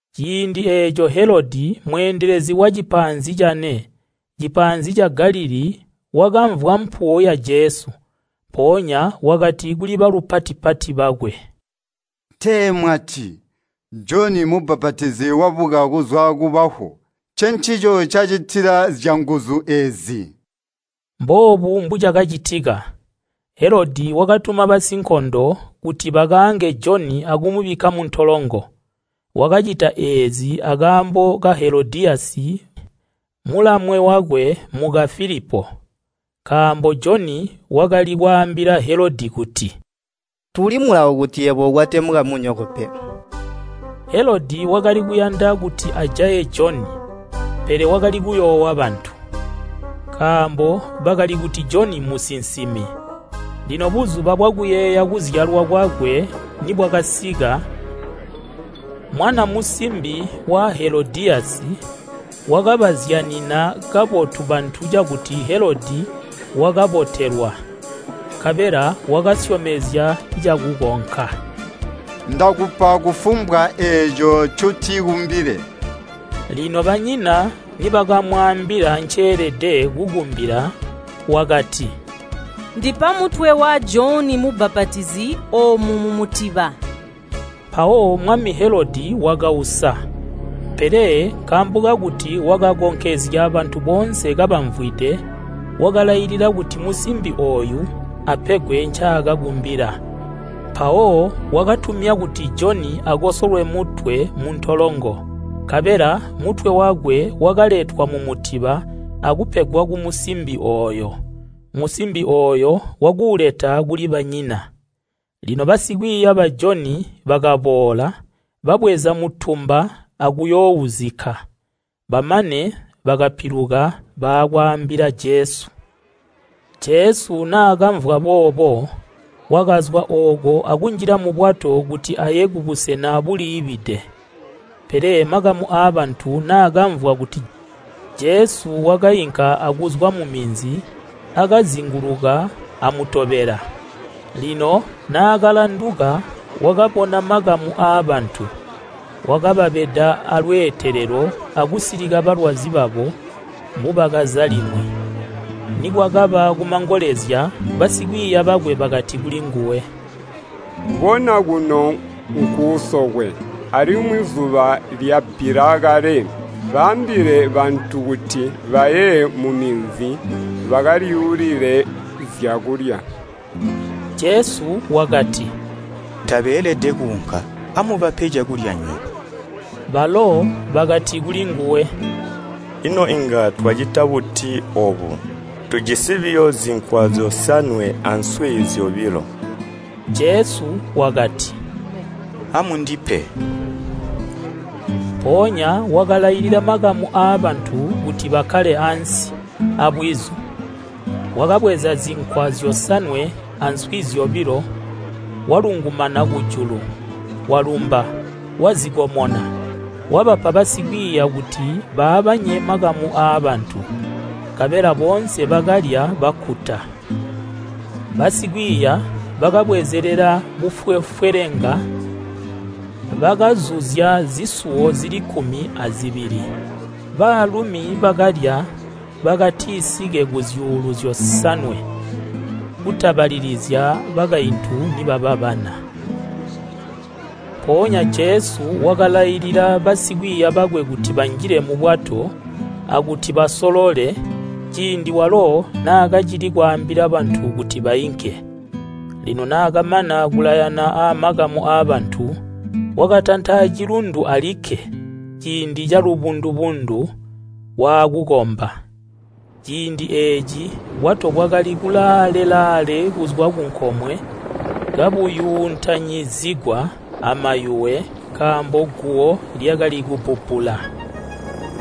Ciindi eeco Helodi mweendelezi wamu Galilii wakamvwa mpuwo ya Jesu. Mpoonya wakati kuli balupati-pati bakwe, “Tee mwati Joni Mubbapatizi wabuka kuzwa kubafu! Ncencico ncacitila zyanguzu eezi.” Mboobu mbucakacitika: Helodi wakatuma basinkondo kuti bakaange Joni akumubikka muntolongo. Wakacita eezi akaambo ka Helodiyasi mulamwe wakwe muka Filipo. Nkaambo Joni wakali kwaambila Helodi kuti “Tuuli mulawo kuti yebo ukwate mukamunyoko pe.” Helodi wakali kuyanda kuti ajaye Joni, pele wakali kuyoowa bantu, nkaambo bakali kuti Joni musinsimi. Lino buzuba bwakuyeeya kuzyalwa kwakwe nibwakasika, mwana musimbi wa Helodiyasi wakabazyanina kabotu bantu cakuti Helodi wakabotelwa. Nkabela wakasyomezya cakukonka “Ndakupa kufumbwa eeco ncotikumbile!” Lino banyina nibakamwaambila nceelede kukumbila wakati, “Ndipa mutwe wa Joni Mubbapatizi omu mumutiba.” Mpawo Helodi wakausa, pele nkaambo kakuti wakakonkezya bantu boonse kabamvwide, wakalailila kuti musimbi ooyu apegwe ncaakakumbila. Mpawo wakatumya kuti Joni akosolwe mutwe muntolongo. Nkabela mutwe wakwe wakaletwa mumutiba akupegwa kumusimbi ooyo, musimbi ooyo wakuuleta kuli banyina. Lino basikwiiya ba Joni bakaboola, babweza mutumba akuyoouzikka. Bamane bakapiluka baakwaambila Jesu. Jesu naakamvwa boobo, wakazwa ooko akunjila mubwato kuti aye kubusena buliibide. Pele makamu aabantu naakamvwa kuti Jesu wainka akuzwa muminzi akazinguluka amutobela. Lino naakalanduka wakabona makamu aabantu, wakababeda alweetelelo akusilika balwazi babo mbubakaza limwi. Nikwakaba kumangolezya basikwiiya bakwe bakati kulinguwe, “Bona kuno nkuusokwe, alimwi zuba lyabbila kale. Baambile bantu kuti baye muminzi bakalyuulile zyakulya.” Jesu wakati, “Tabeelede kuunka. Amubape cakulya nywebo.” Balo bakati kulinguwe, “Ino inga twacita buti oobo? Tujisi buyo zinkwa zyosanwe answi zyobilo.” Jesu wakati, “Amundipe.” Mpoonya wakalailila makamu aabantu kuti bakkale ansi, abwizu. Wakabweza zinkwa zyosanwe answi zyobilo, walungumana kujulu, walumba, wazikomona, wabapa basikwiiya kuti baabanye makamu aabantu. Nkabela boonse bakalya bakkuta. Basikwiiya bakabwezelela bufwefwelenga bakazuzya zisuwo zili kkumi azibili. Baalumi bakalya bakatisike kuzyuulu zyosanwe kutabalilizya bakaintu nibaba bana. Mpoonya Jesu wakalailila basikwiiya bakwe kuti banjile mubwato akuti basolole ciindi walo naakacili kwaambila bantu kuti bainke. Lino naakamana kulayana amakamu aabantu, wakatanta acilundu alikke ciindi calubundu-bundu waakukomba. Ciindi eeci bwato bwakali kulaale-laale kuzwa kunkomwe kabuyuuntanyizigwa amayuwe nkaambo guwo lyakali kubbubbula.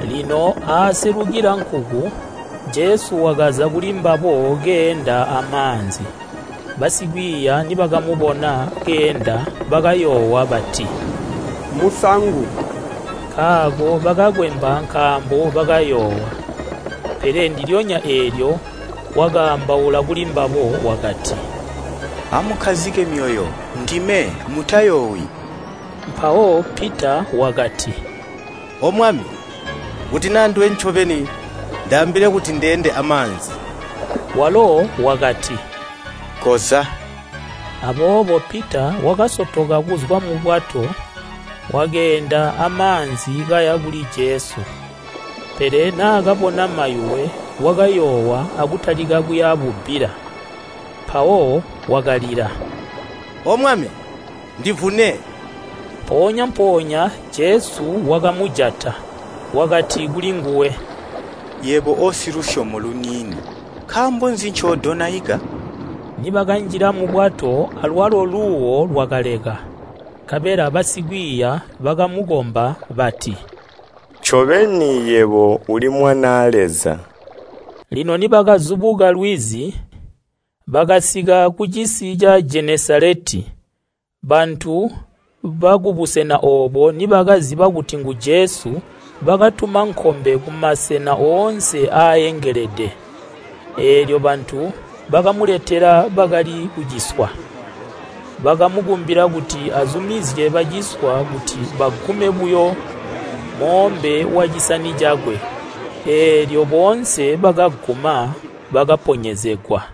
Lino aaselukila nkuku, Jesu wakaza kulimbabo keenda amaanzi. Basikwiiya nibakamubona keenda bakayoowa bati, “Mmusangu!” Nkaako bakakwemba nkaambo bakayoowa. Pele ndilyonya eelyo wakaambaula kulimbabo wakati, “Amukkazike myoyo, ndime. Mutayoowi.” Mpawo Pita wakati, “O Mwami, kuti naa nduwe ncobeni ndaambile kuti ndeende amaanzi.” Walo wakati, “Koza.” Aboobo Pita wakasotoka kuzwa mubwato wakeenda amaanzi kaya kuli Jesu. Pele naakabona mayuwe wakayoowa akutalika kuya bubbila, mpawo wakalila, “O Mwami, ndivune.” Mpoonya-mpoonya Jesu wakamujata, wakati kuli nguwe, “Yebo osilusyomo luniini, nkaambo nzi ncoodonaika?” Nibakanjila mubwato alwalo luuwo lwakaleka. Nkabela basikwiiya bakamukomba bati, “Ncobeni yebo uli Mwanaa Leza.” Lino nibakazubuka lwizi, bakasika kucisi ca Jenesaleti. Bantu bakubusena oobo nibakaziba kuti ngu Jesu bakatuma nkombe kumasena oonse aaengelede. Eelyo bantu bakamuletela bakali kuciswa, bakamukumbila kuti azumizye baciswa kuti bagume buyo moombe wacisani cakwe. Eelyo boonse bakaguma bakaponyezegwa.